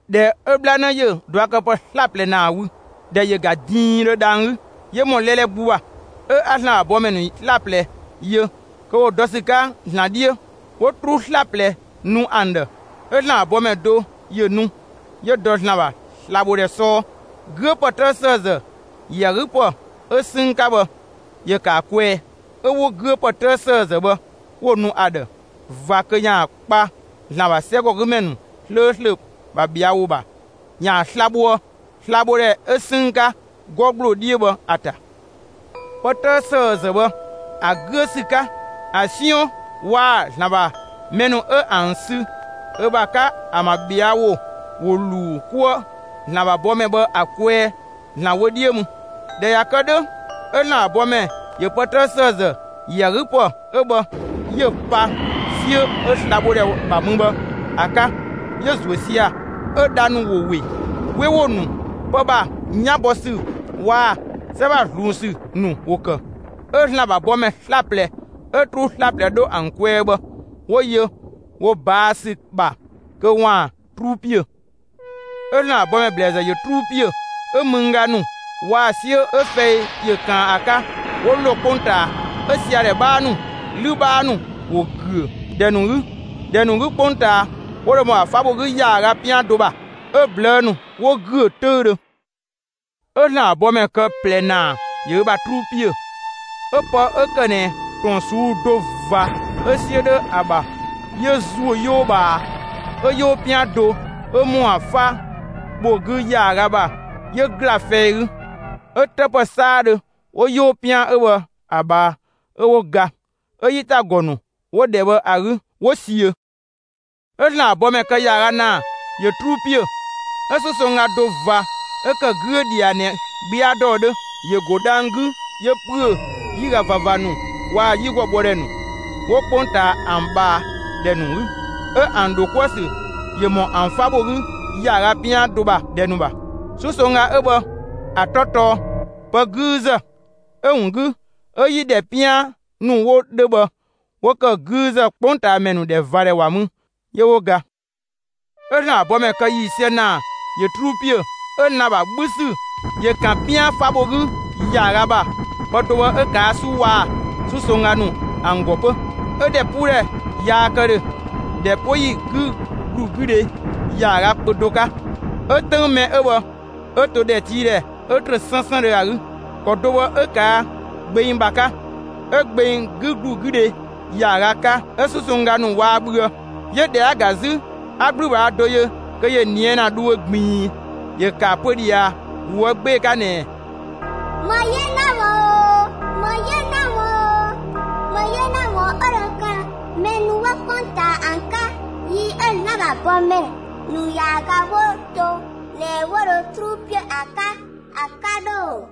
꞊Dhɛ 'ö 'bhlanë ‑yö ꞊duakëpë kë 'slaplɛ ‑naa wü, ‑dhɛ ‑yö ga diindhö dhang‑ 'gü 'yö ‑mɔ 'lɛlɛ 'gbu ‑bha. 'Ö 'a ‑Zlan ‑bha bɔmɛ ‑nu 'slaplɛ yö, kö ‑wo dɔ ‑sü 'ka ‑Zlan 'dhiö; 'wo 'truu 'slaplɛ nu ‑an ‑dhë. 'ö ‑Zlan ‑bha bɔmɛ do ‑yö nu 'yö dɔ ‑Zlan ‑bha slabhodhɛ 'sɔɔ. 'Güö ‑pë 'tëë ‑sëëzë ‑yö ‑a 'gü ‑pë ö 'sënng 'ka bhë ‑yö ‑kë ‑a kwɛɛ, 'ö 'wo 'güö ‑pë 'tëë ‑sëëzë bhë 'wo‑ nu ‑a ‑dhë ꞊va kö ‑yaan kpa ‑Zlan ‑bha 'sɛgɔgümɛ ‑nu 'slööslö ‑bha ꞊bhɛa' ‑wo ‑bha ‑yaan sla‑ bhoë slabhodhɛ 'ö 'sënng 'ka, 'gɔ ‑gbloo 'dhiö bhë ‑a ‑ta. Pë 'tëë ‑sëëzë bhë, ‑a 'güö ‑sü 'ka, ‑a 'siɔn waa‑ ‑Zlan ‑bha mɛ ‑nu 'ö ‑an sü ö ‑bha 'ka ‑an ‑bha ꞊bhɛa' ‑wo ‑wo ‑luu 'kuë ‑Zlan ‑bha bɔmɛ bhë ‑a kwɛɛ ‑Zlan wö 'dhiö mü. ꞊Dhɛ ꞊ya kë 'dhö, 'ö ‑Zlan ‑bha bɔmɛ ‑yö pë 'tëë ‑sëëzë ‑yö ‑a 'gü ‑pë 'ö bhë, 'yö‑ pa 'siö 'ö slabhodhɛ ‑bha mü bhë ‑a 'ka; 'yö‑ ‑zuö sia‑. 'Ö dha ‑nu ‑wo ‑we; 'we ‑wo ‑nu, pë ‑bha 'yan bɔ ‑sü ‑nu waa‑ 'sɛ ‑bha ꞊zluun ‑sü ‑nu ‑wo ‑kë. 'Ö ‑Zlan ‑bha bɔmɛ 'slaplɛ 'ö 'truu 'slaplɛ 'dho ‑an kwɛɛ bhë 'wo yö wo ꞊baa' ‑sü ‑bha kö ‑waan 'truu ‑piö. 'Ö ‑Zlan ‑bha bɔmɛ ‑blɛɛzë ‑yö 'truu ‑piö. 'Ö mëngga ‑nu waa‑ 'siö 'ö fɛi ‑yö ꞊kaan ‑a 'ka, ‑wo ‑lo 'kpongtaa. 'Ö siadhɛ 'bhaa ‑nu, 'lü 'bhaa ‑nu 'wo ‑güö ‑dhɛ ‑nu 'gü, ‑dhɛ ‑nu 'gü 'kpongtaa 'wo dho ‑mɔ ‑a 'fa bho 'gü ‑yaaga 'pian do ‑bha. 'Ö ꞊blëë' ‑nu 'wo ‑güö 'töüdhö. 'Ö ‑Zlan ‑bha bɔmɛ kë ꞊plɛ ‑naa ‑yö ö ‑bha 'truu ‑piö. 'Ö pë 'ö ‑kë ꞊nɛ ‑tɔn ꞊suu'‑ do ꞊va 'ö 'siö 'dhö ‑a ‑bha, 'yö ‑zuö 'yoo ꞊bhaa, 'ö 'yoo 'pian do 'ö ‑mɔ ‑a 'fa bho 'gü ‑yaaga ‑bha ‑yö ‑gla fɛi 'gü. 'Ö 'të ‑pë 'saadhö 'wo 'yoo 'pian 'ö bhë ‑a ꞊bhaa, 'ö 'wo ga; 'ö 'yi ‑ta ‑gɔ ‑nu 'wo ‑dhɛ bhë ‑a 'gü 'wo ‑siö. 'Ö ‑Zlan ‑bha bɔmɛ kë ‑yaaga ‑naa ‑yö 'truu ‑piö. 'Ö 'susongga do ꞊va 'ö ‑kë 'güö ꞊dhia ꞊nɛ 'gbia ‑dɔɔ 'dhö ‑yö ‑go dhang‑ 'gü 'yö ‑püö 'yiga ꞊vava ‑nu waa‑ 'yigɔbhɔdhɛ ‑nu 'wo 'kpongtaa ‑an ꞊bhaa ‑dhɛ ‑nu 'gü, 'ö ‑an ‑dho 'kuë‑ ‑sü ‑yö ‑mɔ ‑an 'fa bho 'gü ‑yaaga 'pian do ‑bha ‑dhɛ ‑nu ‑bha. 'Susongga 'ö bhë ‑a 'tɔ tɔɔ «Pë 'güüzë». 'Ö‑ ‑wun 'gü, 'ö 'yi ‑dhɛ 'pian ‑nu 'wo 'dhö bhë 'wo ‑kë 'güüzë; 'kpongtaamɛ ‑nu ‑dhɛ ꞊va ‑dhɛ ‑wa mü; 'yö 'wo ga. 'Ö ‑Zlan ‑bha bɔmɛ kë ‑yiisië ‑naa ‑yö 'truu ‑piö. 'Ö lan‑ ‑bha 'bhü ‑sü ‑yö ‑kan 'pian 'fa bho 'gü ‑yaaga ‑bha; pë do bhë 'ö ꞊kaa' 'su waa‑ 'susongga ‑nu ‑an ‑gɔ 'pö. 'Ö ‑dhɛpuudhɛ yaa kë ‑dhö ‑dhɛ 'po yi 'gü ‑glu 'gü dhe ‑yaaga kpö do 'ka, 'ö 'töng mɛ 'ö bhë 'ö to ‑dhɛtiidhɛ 'ö trö 'sënsëndhö ‑a 'gü. ‑Kɔ do bhë 'ö ꞊kaa' gbeng ‑bha 'ka; 'ö gbeng 'gü ‑glu 'gü dhe ‑yaaga 'ka 'ö 'susongga ‑nu waa bhüë. 'Yö ꞊dhɛ 'a‑ ‑ga 'zü, 'a 'gblübhaa do yö kö ‑yö ꞊nië' ‑na dhuö ꞊gbiin. ‑Yö ‑kë ‑a pö ꞊dhia ꞊woë' 'gbee‑ 'ka ꞊nɛ: «‑Më 'yena ‑wun oo, ‑më 'yena ‑wun oo, ‑më 'yena ‑wun 'ö dho kë mɛ ‑nu 'wo 'kpongtaa ‑an 'ka, yi 'ö ‑Zlan ‑bha bɔmɛ ‑nu ‑yaaga 'wo to ꞊nɛ 'wo dho 'truu ‑piö ‑a 'ka ‑a 'ka 'dhö ‑oo!»